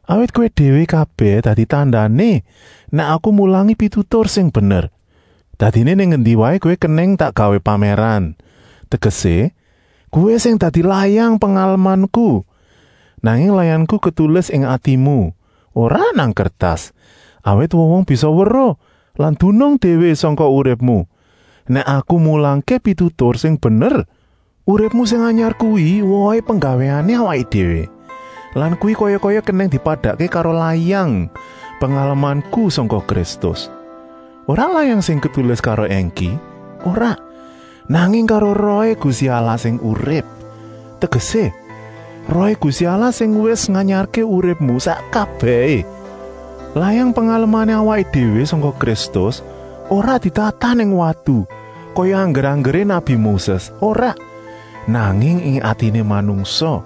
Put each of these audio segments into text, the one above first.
Awit kowé déwé kabèh dadi tandané nèk aku mulangi pitutur sing bener. Dadiné nang endi waé kowé kenèng tak gawé pamèran, tegesé, kowé sing dadi layang pengalemanku. Nanging layangku ketulis ing atimu, ora nang kertas, awit wong-wong bisa weruh lan dunung déwé sangka uripmu, nèk aku mulangké pitutur sing bener. Uripmu sing anyar kuwi wohé penggawéané awaké déwé lan kuwi kaya-kaya kenèng dipadakké karo layang pengalemanku sangka Kristus. Ora layang sing ketulis karo èngki, ora, nanging karo Rohé Gusti Allah sing urip. Tegesé, Rohé Gusti Allah sing wis nganyarké uripmu sak kabèhé. Layang pengalemané awaké déwé sangka Kristus ora ditatah nang watu kaya angger-anggeré nabi Moses, ora, nanging ing atiné manungsa.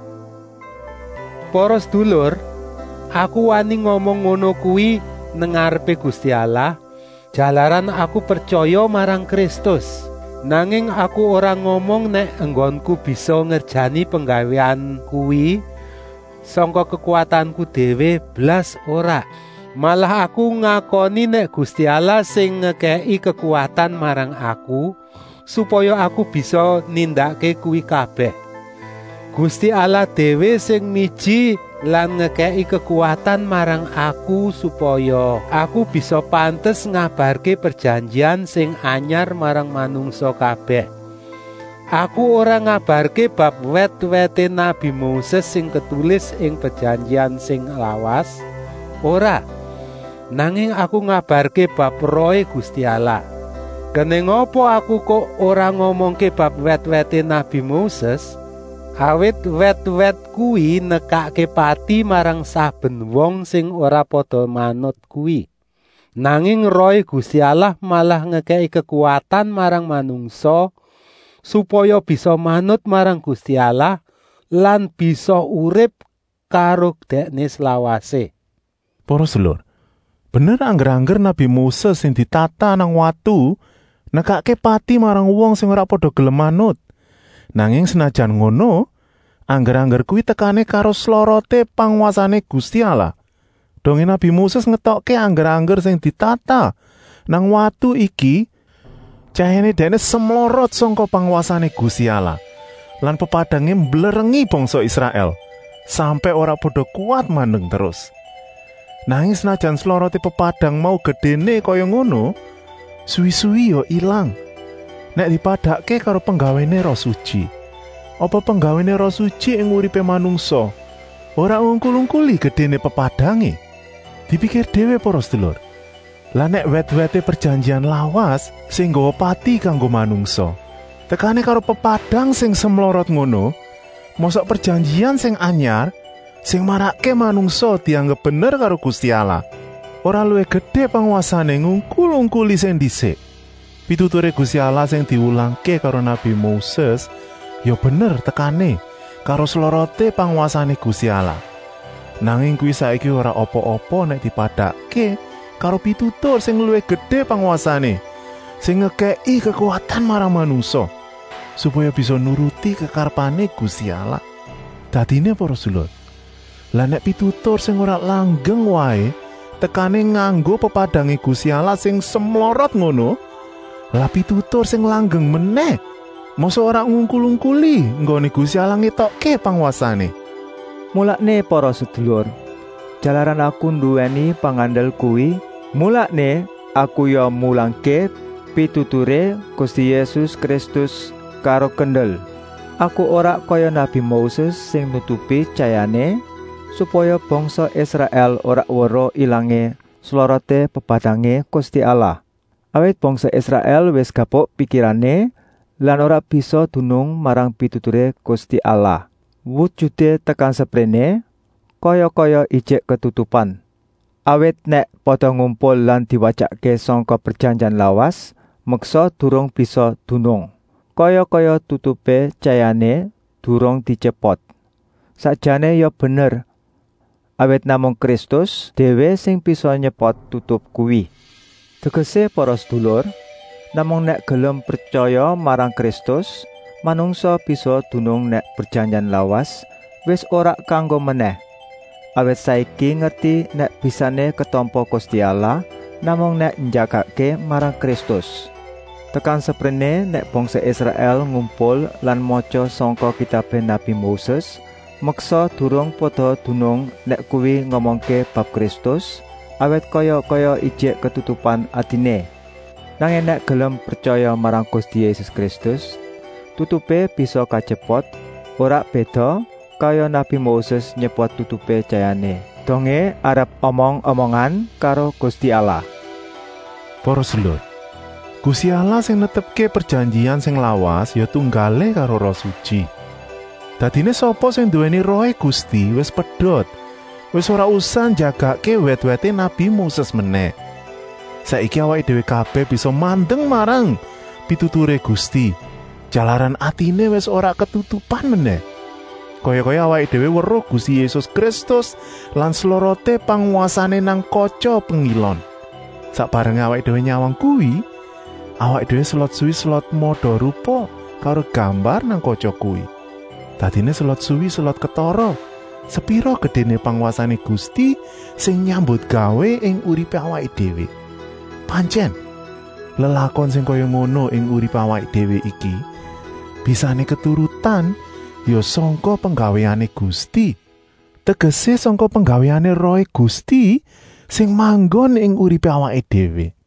Para sedulur, aku wani ngomong ngono kuwi nang ngarepé Gusti Allah, jalaran aku pretyaya marang Kristus. Nanging aku ora ngomong nèk enggonku bisa ngerjani penggawéan kuwi sangka kekuwatanku déwé, blas ora, malah aku ngakoni nèk Gusti Allah sing ngekèki kekuwatan marang aku, supaya aku bisa nindakké kuwi kabèh. Gusti Allah déwé sing miji lan ngekèki kekuwatan marang aku supaya, aku bisa pantes ngabarké prejanjian sing anyar marang manungsa kabèh. Aku ora ngabarké bab wèt-wèt nabi Moses sing ketulis ing prejanjian sing lawas, ora, nanging aku ngabarké bab Rohé Gusti Allah. Kenèng apa aku kok ora ngomongké bab wèt-wèt nabi Moses? Awit wèt-wèt kuwi nekakké pati marang saben wong sing ora pada manut kuwi. Nanging Rohé Gusti Allah malah ngekèki kekuwatan marang manungsa, supaya bisa manut marang Gusti Allah lan bisa urip karo Dèkné slawasé. Para sedulur, bener angger-angger nabi Moses sing ditatah nang watu nekakké pati marang wong sing ora pada gelem manut, nanging senajan ngono, angger-angger kuwi tekané karo sloroté pangwasané Gusti Allah. Dongé nabi Moses ngetokké angger-angger sing ditatah nang watu iki tyayahné dèkné semlorot sangka pangwasané Gusti Allah lan pepadangé mblerengi bangsa Israèl, sampèk ora pada kuwat mandeng terus. Nanging senajan sloroté pepadang mau gedéné kaya ngono, suwi-suwi ya ilang. Nèk dipadakké karo penggawéné Roh Sutyi, apa penggawéné Roh Sutyi ing uripé manungsa ora ngungkul-ungkuli gedéné pepadangé? Dipikir déwé para sedulur, lah nèk wèt-wèté prejanjian lawas, sing nggawa pati kanggo manungsa, tekané karo pepadang sing semlorot ngono, mosok prejanjian sing anyar, sing marakké manungsa dianggep bener karo Gusti Allah, ora luwih gedé pangwasané, ngungkul-ungkuli sing ndisik. Pituturé Gusti Allah sing diwulangké karo nabi Moses ya bener tekané karo sloroté pangwasané Gusti Allah, nanging kuwi saiki ora apa-apa nèk dipadakké karo pitutur sing luwih gedé pangwasané, sing ngekèki kekuwatan marang manungsa, supaya bisa nuruti kekarepané Gusti Allah. Dadiné para sedulur, lah nèk pitutur sing ora langgeng waé tekané nganggo pepadangé Gusti Allah sing semlorot ngono, lah pitutur sing langgeng menèh, mosok ora ngungkul-ungkuli enggoné Gusti Allah ngétokké pangwasané? Mulané para sedulur, jalaran aku nduwèni pengandel kuwi, mulané aku ya mulangké pituturé Gusti Yésus Kristus karo kendel. Aku ora kaya nabi Moses sing nutupi tyayahné, supaya bangsa Israèl ora weruh ilangé sloroté pepadangé Gusti Allah. Awit bangsa Israèl wis gapuk pikirané lan ora bisa dunung marang pituturé Gusti Allah. Wujuté tekan sepréné kaya-kaya ijik ketutupan, awit nèk pada ngumpul lan diwatyakké sangka prejanjian lawas, meksa durung bisa dunung. Kaya-kaya tutupé tyayahné durung dityepot. Sakjané ya bener, awit namung Kristus déwé sing bisa nyepot tutup kuwi. Tegesé para sedulur, namung nèk gelem pretyaya marang Kristus manungsa bisa dunung nèk prejanjian lawas wis ora kanggo menèh, awit saiki ngerti nèk bisané ketampa Gusti Allah namung nèk njagakké marang Kristus. Tekan sepréné nèk bangsa Israèl ngumpul lan matya sangka kitabé nabi Moses, meksa durung pada dunung nèk kuwi ngomongké bab Kristus, awit kaya-kaya ijik ketutupan atiné. Nanging nèk gelem pretyaya marang Gusti Yésus Kristus, tutupé bisa katyepot, ora béda kaya nabi Moses nyepot tutupé tyayahné, dongé arep omong-omongan karo Gusti Allah. Para sedulur, Gusti Allah sing netepké prejanjian sing lawas ya tunggalé karo Roh Sutyi. Dadiné sapa sing nduwèni Rohé Gusti wis pedot, wis ora usah njagakké wèt-wèté nabi Moses menèh. Saiki awaké déwé kabèh bisa mandeng marang pituturé Gusti, jalaran atiné wis ora ketutupan menèh. Kaya-kaya awaké déwé weruh Gusti Yésus Kristus lan sloroté pangwasané nang katya pengilon. Sak barengé awaké déwé nyawang kuwi, awaké déwé selot suwi selot mada-rupa karo gambar nang katya kuwi. Dadiné selot suwi selot ketara sepira gedéné pangwasané Gusti sing nyambutgawé ing uripé awaké déwé. Pantyèn, lelakon sing kaya ngono ing uripé awaké déwé iki bisané keturutan ya sangka penggawéané Gusti, tegesé sangka penggawéané Rohé Gusti sing manggon ing uripé awaké déwé.